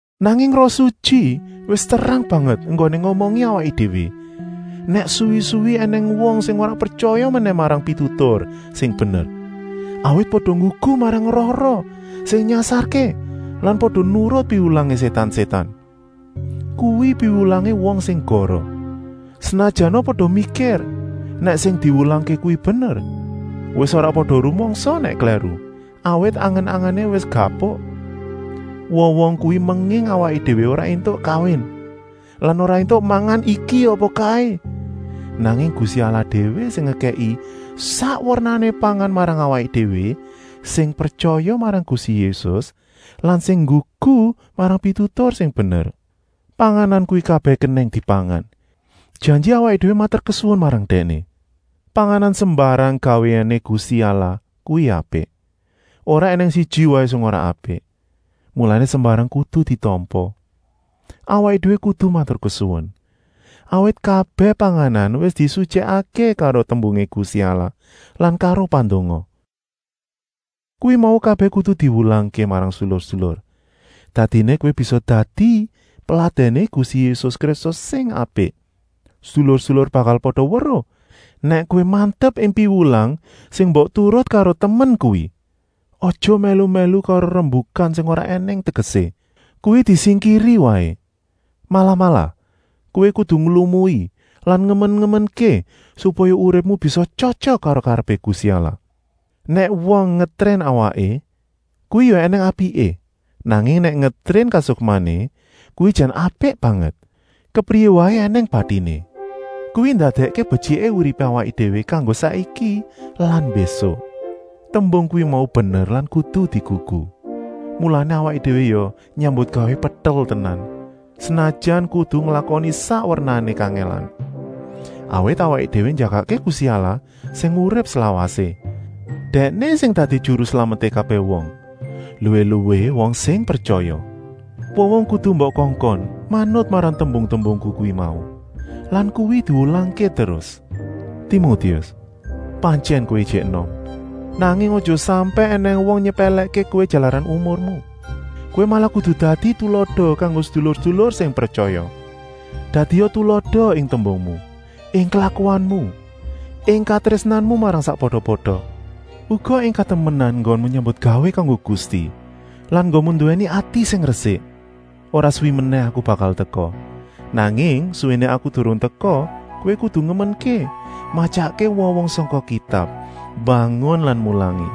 Nanging Roh Sutyi wis terang banget enggoné ngomongi awaké déwé nèk suwi-suwi ènèng wong sing ora pretyaya menèh marang pitutur sing bener, awit pada nggugu marang roh-roh sing nyasarké lan pada nurut piwulangé sétan-sétan. Kuwi piwulangé wong sing goroh, senajana pada mikir nèk sing diwulangké kuwi bener. Wis ora pada rumangsa nèk klèru, awit angen-angené wis gapuk. Wong-wong kuwi menging awaké déwé ora éntuk kawin lan ora éntuk mangan iki apa kaé. Nanging Gusti Allah déwé sing ngekèki sak wernané pangan marang awaké déwé sing pretyaya marang Gusti Yésus lan sing nggugu marang pitutur sing bener. Panganan kuwi kabèh kenèng dipangan, janji awaké déwé maturkesuwun marang Dèkné. Panganan sembarang gawéané Gusti Allah kuwi apik, ora ènèng siji waé sing ora apik. Mulané sembarang kudu ditampa. Awaké déwé kudu maturkesuwun, awit kabèh panganan wis disutyèkké karo tembungé Gusti Allah lan karo pandonga. Kuwi mau kabèh kudu diwulangké marang sedulur-sedulur, dadiné kowé bisa dadi peladèné Gusti Yésus Kristus sing apik. Sedulur-sedulur bakal pada weruh nèk kowé mantep ing piwulang sing mbok turut karo temen kuwi. Aja mèlu-mèlu karo rembukan sing ora ènèng tegesé, kuwi disingkiri waé. Malah-malah, kowé kudu nglumui lan ngemen-ngemenké supaya uripmu bisa tyotyok karo karepé Gusti Allah. Nèk wong ngetrén awaké, kuwi ya ènèng apiké, nanging nèk ngetrén kasukmané, kuwi jan apik banget, kepriyé waé ènèng batiné. Kuwi ndadèkké betyiké uripé awaké déwé kanggo saiki lan mbésuk. Tembung kuwi mau bener lan kudu digugu. Mulané awaké déwé ya nyambutgawé petel tenan, senajan kudu nglakoni sak wernané kangèlan. Awit awaké déwé njagakké Gusti Allah sing urip slawasé. Dèkné sing dadi Juru Slameté kabèh wong, luwih-luwih wong sing pretyaya. Wong-wong kudu mbok kongkon manut marang tembung-tembungku kuwi mau lan kuwi diwulangké terus. Timotius, pantyèn kowé ijik enom, nanging aja sampèk ènèng wong nyepèlèkké kowé jalaran umurmu. Kowé malah kudu dadi tulada kanggo sedulur-sedulur sing pretyaya. Dadia tulada ing tembungmu, ing klakuanmu, ing katrésnanmu marang sakpada-pada, uga ing katemenan enggonmu nyambutgawé kanggo Gusti lan enggonmu nduwèni ati sing resik. Ora suwi menèh aku bakal teka, nanging suwéné aku durung teka kowé kudu ngemenké matyakké wong-wong sangka Kitab, mbangun lan mulangi.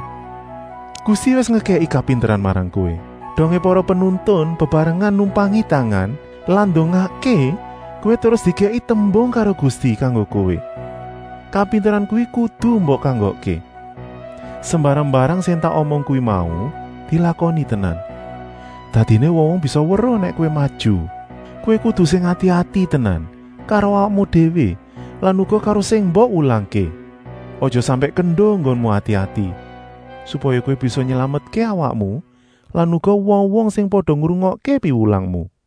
Gusti wis ngekèki kapinteran marang kowé, dongé para penuntun bebarengan numpangi tangan lan ndongakké kowé terus dikèki tembung karo Gusti kanggo kowé. Kapinteran kuwi kudu mbok kanggokké. Sembarang-mbarang sing tak omong kuwi mau dilakoni tenan, dadiné wong-wong bisa weruh nèk kowé maju. Kowé kudu sing ati-ati tenan karo awakmu déwé lan uga karo sing mbok wulangké. Aja sampèk kendo enggonmu ati-ati, supaya kowé bisa nylametké awakmu lan uga wong-wong sing pada ngrungokké piwulangmu.